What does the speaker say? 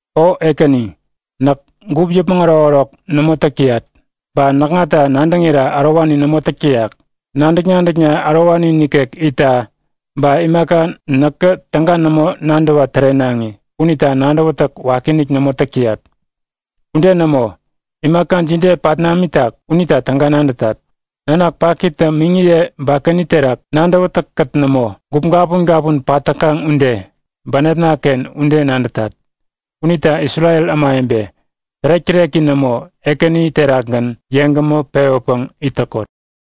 O Ekäni, näk gup yäpmäŋ ärokärok nämo täk täyat. Ba näkŋata nadäŋira ärowani nämo täk täyak. Nadäk-nadäkna ärowani nikek itta ba imaka näkä täga nämo nadäwa tärenaŋi unita nadäwätäk wakiinik nämo täk täyat. Ude nämo. Imaka jide pat namitak unita täga nadätat. Nanak pakitä miŋiye bakani terak nadäwätäkkät nämo, gup gapun gapun pat täkaŋ ude, bänepnaken ude nadätat. Unita Isrel ämawebe, tärek-täreki nämo Ekäni terakgän yeŋgämä pewäpäŋ it täkot!